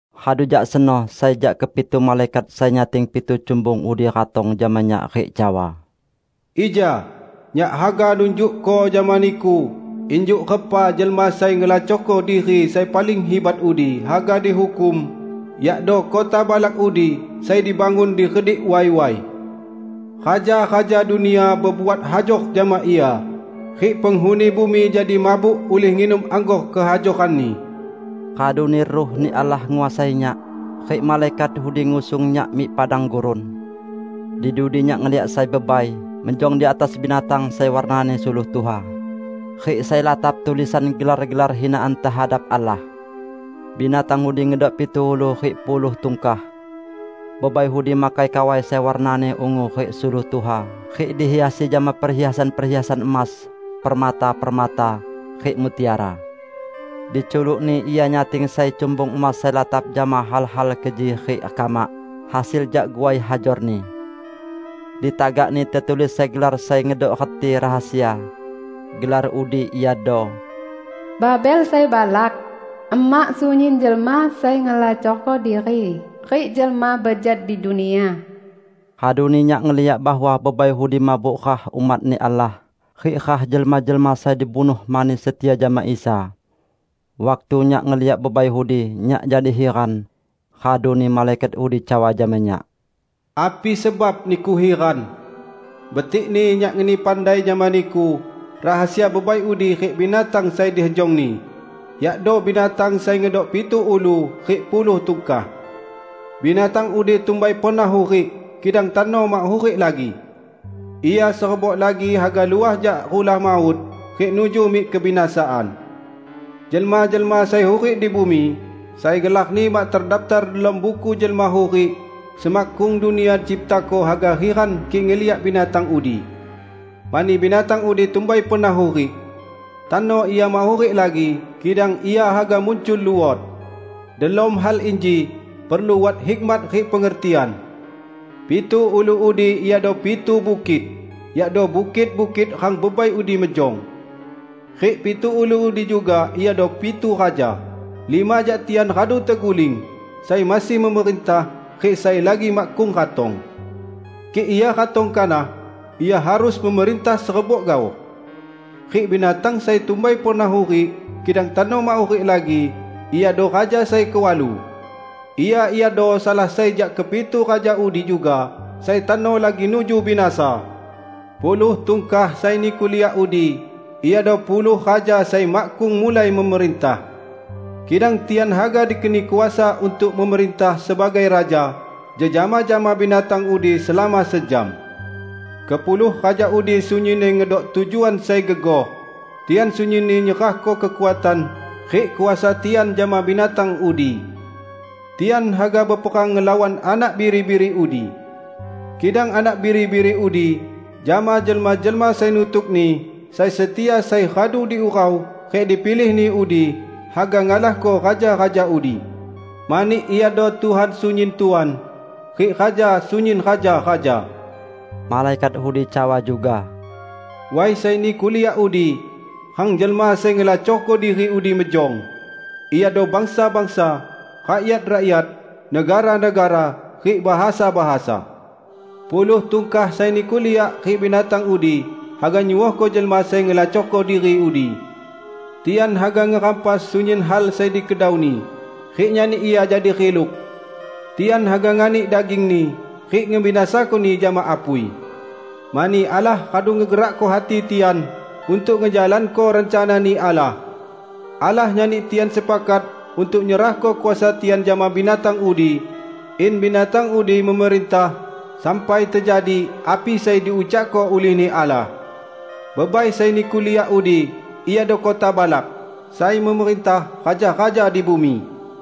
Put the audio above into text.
Radu jak seno sai jak kepitu malaikat sai nyating pitu cumbung udi ratong jama nyak rik cawa, "Ija, nyak haga nunjukko jama niku injuk repa jelma sai ngelacorko diri sai paling hibat udi haga dihukum, yakdo kota balak udi sai dibangun di redik way-way. Raja-raja dunia bebuat hajor jama ia, rik penghuni bumi jadi mabuk ulih nginum anggor kehajoranni." Raduni Ruh-Ni Allah nguasai nyak, rik malaikat udi ngusung nyak mik padang gurun. Di dudi nyak ngeliak sai bebai mejong di atas binatang sai warnani suluh tuha, rik sai latap tulisan gelar-gelar hinaan tehadap Allah. Binatang udi ngedok pitu ulu rik puluh tungkah. Bebai udi makai kawai sai warnani ungu rik suluh tuha, rik dihiasi jama perhiasan-perhiasan emas, permata-permata, rik mutiara. Di culukni ia nyating sai cumbung emas sai latap jama hal-hal keji rik kamak, hasil jak guai hajorni. Di tagakni tetulis sai gelar sai ngedok reti rahasia. Gelar udi iado "Babel Sai Balak, emak sunyin jelma sai ngelacorko diri rik jelma bejat di dunia." Raduni nyak ngeliak bahwa bebai udi mabuk rah umat-Ni Allah rik rah jelma-jelma sai dibunuh mani setia jama Isa. Waktu nyak ngeliak bebai udi, nyak jadi hiran. Raduni malaikat udi cawa jama nyak, "Api sebab niku hiran? Betikni nyak ngeni pandai jama niku rahasia bebai udi rik binatang sai dihejongni, yakdo binatang sai ngedok pitu ulu rik puluh tungkah. Binatang udi tumbai pernah hurik, kidang tano mak hurik lagi. Ia serebok lagi haga luah jak rulah maut rik nuju mik kebinasaan. Jelma-jelma sai hurik di bumi, sai gelarni mak tedaptar delom Buku Jelma Hurik semakkung dunia diciptako haga hiran kik ngeliak binatang udi. Mani binatang udi tumbai pernah hurik. Tano ia mak hurik lagi, kidang ia haga muncul luot. Delom hal inji perlu wat hikmat rik pengertian. Pitu ulu udi iado pitu bukit; yakdo bukit-bukit rang bebai udi mejong. Rik pitu ulu udi juga iado pitu raja: lima jak tian radu teguling, sai masih memerintah, rik sai lagi makkung ratong. Kik ia ratong kanah, ia harus memerintah serebok gaoh. Rik binatang sai tumbai pernah hurik, kidang tano mak hurik lagi, iado raja sai kewalu. Ia iado salah sai jak kepitu raja udi juga, sai tano lagi nuju binasa. Puluh tungkah sai niku liak udi iado puluh raja sai makkung mulai memerintah. Kidang tian haga dikeni kuasa untuk memerintah sebagai raja jejama jama binatang udi selama sejam. Kepuluh raja udi sunyinni ngedok tujuan sai gegoh; tian sunyinni nyerahko kekuatan rik kuasa tian jama binatang udi. Tian haga beperang ngelawan Anak Biri-biri udi. Kidang Anak Biri-biri udi jama jelma-jelma sai nutuk-Ni sai setia sai radu diurau rik dipilih-Ni udi haga ngalahko raja-raja udi, mani Iado Tuhan sunyin tuan, rik Raja sunyin raja-raja." Malaikat udi cawa juga, "Way sai niku liak udi, rang jelma sai ngelacorko diri udi mejong, iado bangsa-bangsa, rakyat-rakyat, negara-negara rik bahasa-bahasa. Puluh tungkah sai niku liak rik binatang udi haga nyuohko jelma sai ngelacorko diri udi. Tian haga ngerampas sunyin hal sai dikedauni, rik nyani ia jadi riluk. Tian haga nganik dagingni rik ngebinasakoni jama apui. Mani Allah radu ngegerakko hati tian untuk ngejalanko rencana-Ni Allah. Allah nyani tian sepakat untuk nyerahko kuasa tian jama binatang udi, in binatang udi memerintah sampai tejadi api sai diucakko ulih-Ni Allah. Bebai sai niku liak udi iado kota balak, sai memerintah raja-raja di bumi."